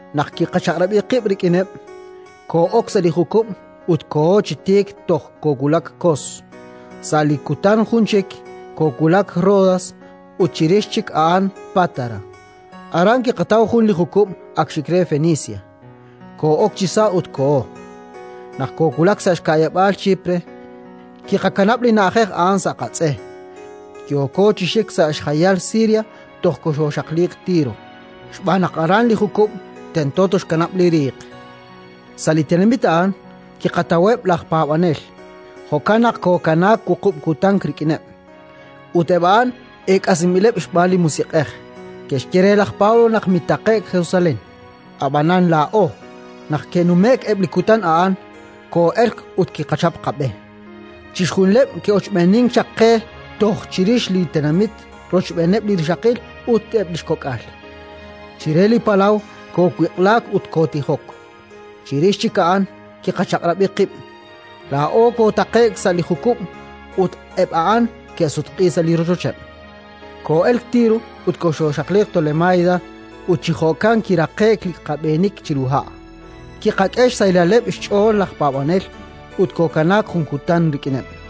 Naq kiqachaq'rab'i qib' rik'ineb', koo'ok sa' li jukub' ut kooho chi tiik toj koowulak Kos; sa' li kutan jun chik koowulak Rodas ut chirix chik a'an Pátara. Aran kiqataw jun li jukub' ak xik re Fenicia; koo'ok chisa' ut kooho. Naq koowulak sa' xka'yab'aal Chipre, kiqakanab' li na'ajej a'an sa' qatz'e, yooko chi xik sa' xjayal Siria toj koxooxaqliiq Tiro, xb'aan naq aran li jukub' tento toxkanab' li riiq. Sa' li tenamit a'an kiqataweb' laj paab'anel; jo'kan naq kookanaak wuqub' kutan rik'ineb'. Ut eb' a'an eek'asinb'ileb' xb'aan li Musiq'ej ke'xye re laj Pablo naq mitaqe'k Jerusalén. Ab'anan laa'o, naq ke'nume'k eb' li kutan a'an, koo'elk ut kiqachap qab'e. Chixjunileb' ke'ochb'eenink chaq qe toj chirix li tenamit rochb'eeneb' li rixaqil ut eb' li xkok'al. Chire li palaw koowiq'laak ut kootijok. Chirix chik a'an kiqachaq'rab'i qib': laa'o kootaqe'k sa' li jukub' ut eb' a'an ke'sutq'iik sa' rochocheb'. Koo'elk Tiro ut koxooxaqliiq Tolemaida, ut chi jo'kan kiraqe'k li qab'eenik chiru ha'. Kiqak'e xsahilaleb' xch'ool laj paab'anel ut kookanaak jun kutan rik'ineb'.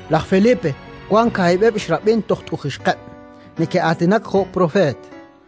Laj Felipe wank kaahib'eb' xrab'in toj tuq'ixqeb', neke'aatinak jo' propeet.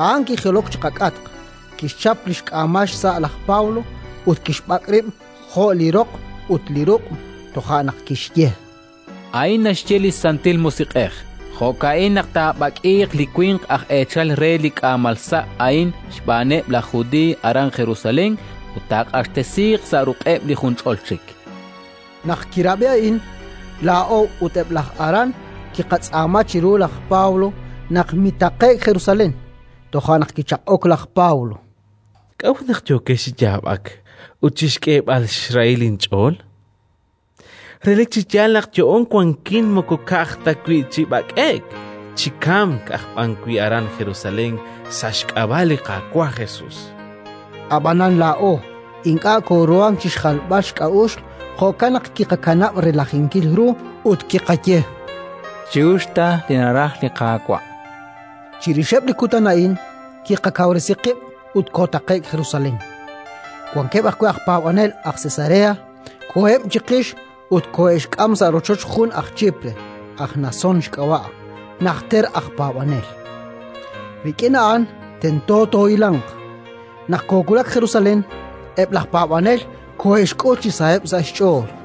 A'an kijilok chi qak'atq, kixchap li xk'aamal xsa' laj Pablo ut kixb'ak' rib' jo' li roq ut li ruq'; toja' naq kixye: —A'in naxye li Santil Musiq'ej: Jo'ka'in naq taab'ak'iiq li winq aj eechal re li k'aamalsa' a'in xb'aaneb' laj Judiiy aran Jerusalén, ut taaq'axtesiiq sa' ruq'eb' li junch'ol chik. Naq kiqab'i a'in, laa'o ut eb' laj aran kiqatz'aama chiru laj Pablo naq mitaqe'k Jerusalén. Toja' naq kichaq'ok laj Pablo: —K'a'ut naq yookex chi yaab'ak ut chi xk'eeb'al xrahil inch'ool? Relik chi yaal naq yo'oon wankin moko ka'aj ta wi' chi b'ak'e'k, chi kamk aj b'an wi' aran Jerusalén sa' xk'ab'a' li Qaawa' Jesus, chan. Ab'anan laa'o ink'a' kooruhank chi xjalb'al xk'a'uxl; jo'kan naq kiqakanab' relajinkil ru ut kiqaye: —Chi'uxq ta li naraj li Qaawa'. Chirixeb' li kutan a'in kiqakawresi qib' ut kootaqe'k Jerusalén. Wankeb' ajwi' aj paab'anel aj Cesarea koheb' chiqix ut koohe'xk'am sa' rochoch jun aj Chipre, aj Nasón xk'ab'a', najter aj paab'anel. Rik'in a'an tento toohilanq. Naq koowulak Jerusalén, eb' laj paab'anel koohe'xk'ul chi saheb' sa' xch'ool.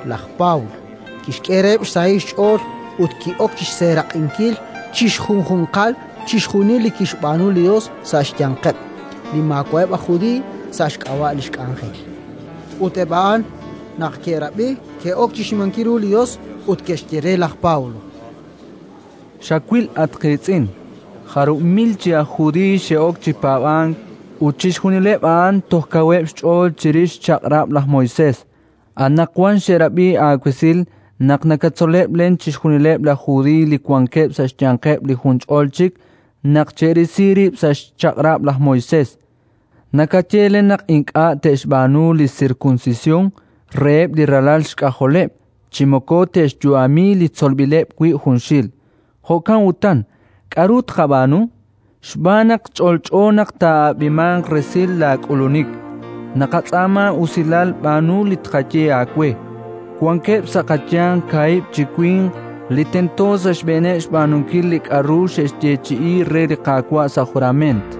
Laj Pablo kixk'eheb' xsahil xch'ool ut ki'ok chi xseeraq'inkil chi xjunjunqal chixjunil li kixb'aanu li Yos sa' xyanqeb' li maawa'eb' aj Judiiy sa' xk'ab'a' li xk'anjel. Ut eb' a'an, naq ke'rab'i, ke'ok chi xnimankil ru li Yos ut ke'xye re laj Pablo: —Xawil, at qiitz'in, jarub' mil chi aj Judiiy xe'ok chi paab'ank, ut chixjunileb' a'an toj kaweb' xch'ool chirix xchaq'rab' laj Moisés. Anaqwan xe'rab'i aawesil naq nakatzoleb' len chixjunileb' laj Judiiy li wankeb' sa' xyanqeb' li junch'ol chik naq che'risi rib' sa' xchaq'rab' laj Moisés. Nakaye len naq ink'a' te'xb'aanu li sirkunsisyon reheb' li ralal xk'ajoleb' chi moko te'xyu'ami li tzolb'ileb' wi' junxil. Jo'kan utan, k'aru tqab'aanu? Xb'aan naq ch'olch'o naq taa'ab'imanq resil laak'ulunik. Naqatz'aama usilal, b'aanu li tqaye aawe: Wankeb' sa' qayanq kaahib' chi winq li tento sa' xb'eeneb' xb'aanunkil li k'aru xe'xyeechi'i re li Qaawa' sa' jurament.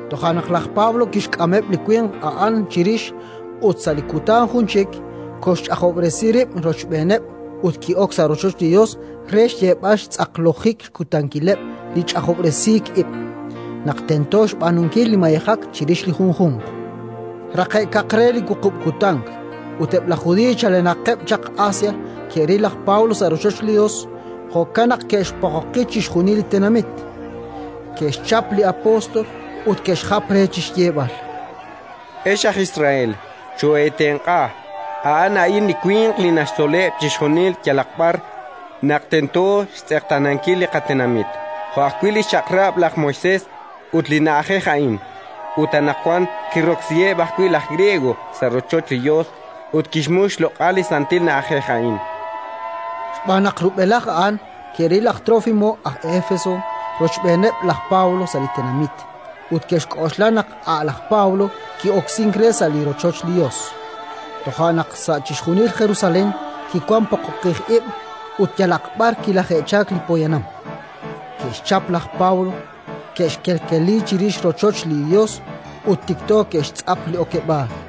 Toja' naq laj Pablo kixk'ameb' li winq a'an chirix ut, sa' li kutan jun chik, koxxch'ajob'resi rib' rochb'eeneb' ut ki'ok sa' rochoch li Yos re xyeeb'al xtz'aqlojik xkutankileb' li ch'ajob'resij ib', naq tento xb'aanunkil li mayejak chirix li junjunq. Raqe'kaq re li wuqub' kutan, eb' laj Judiiy chalenaqeb' chaq Asia ke'ril laj Pablo sa' rochoch li Yos; jo'kan naq ke'xpoqoqi chixjunil li tenamit, ke'xchap li apóstol ut ke'xjap re chi xyeeb'al: “Ex aj Israel, chooheetenq'a! A'an a'in li winq li naxtzoleb' chixjunil yalaq b'ar naq tento xtz'eqtaanankil li qatenamit, jo' ajwi' li xChaq'rab' laj Moisés ut li na'ajej a'in. Ut anaqwan kiroksiheb' ajwi' laj Griego sa' rochoch li Yos ut kixmux xloq'al li santil na'ajej a'in”. Xb'aan naq rub'elaj a'an ke'ril laj Trófimo aj Éfeso rochb'eeninkil laj Pablo sa' li tenamit, ut ke'xk'oxla naq a' laj Pablo ki'oksink re sa' rochoch li Yos. Toja' naq sa' chixjunil Jerusalén kiwank poqoqij ib' ut yalaq b'ar kilaje'chalk li poyanam. Ke'xchap laj Pablo, ke'xkeleli chirix rochoch li Yos ut tikto ke'xtz'ap li okeb'aal.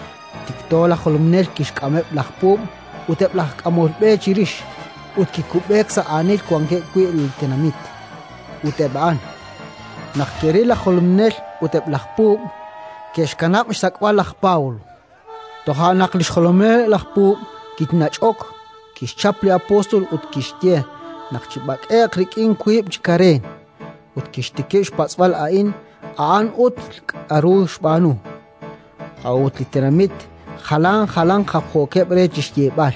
Tikto laj jolominel kixk'ameb' laj puub' ut eb' laj k'amol b'e chirix, ut kikub'eek sa' aanil wankeb' wi' li tenamit; ut eb' a'an, naq ke'ril laj jolominel ut eb' laj puub', ke'xkanab' xsak'b'al laj Pablo. Toja' naq li xjolomileb' laj puub' kinach'ok, kixchap li apóstol ut kixye naq chib'ak'e'q rik'in wiib' chi kareen; ut kixtikib' xpatz'b'al ani a'an ut k'aru xb'aanu. A'ut li tenamit jalan jalanq japjookeb' re chi xyeeb'al,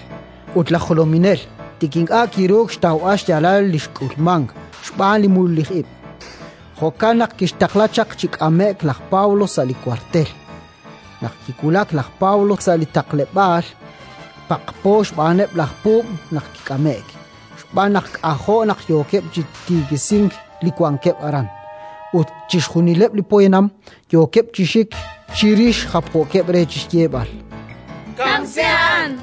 ut laj jolominel tik ink'a' kiruuk xtawb'al xyaalal li xk'ulmank, xb'aan li mululij ib'. Jo'kan naq kixtaqla naq chik'ame'q laj Pablo sa' li wartel. Naq kiwulak laj Pablo sa' li taqleb'aal, paqpo xb'aaneb' laj puub' naq kik'ame'k, xb'aan naq k'ajo' naq yookeb' chi tikisink li wankeb' aran, ut chixjunileb' li poyanam yookeb' chi xik chirix japjookeb' re chi xyeeb'al: “Kamsi a'an!”.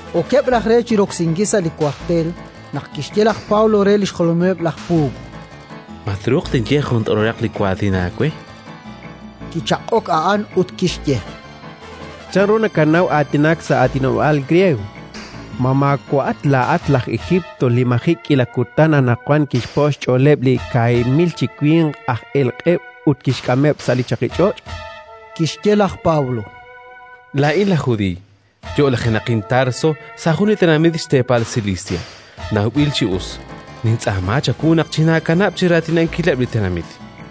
Okeb' raj re chi roksinkil sa' li wartel naq kixye laj Pablo re li xjolomileb' laj puub': —Ma truuq tinye jun t'orolaq li waatin aawe? Kichaq'ok a'an ut kixye: —Chanru nakanaw aatinak sa' aatinob'aal griego? Ma maawa'at laa'at laj Ejiipt li maji' k'iila kutan anaqwan kixpo' xch'ooleb' li kaahib' mil chi winq aj elq'eb' ut kixk'ameb' sa' li chaqich'och'? Kixye laj Pablo: —Laa'in aj Judiiy, yo'lajenaqin Tarso, sa' jun tenamit xteepal Silisia nawb'il chi us. Nintz'aama chawu naq chinaakanab' chi raatinankileb' li tenamit.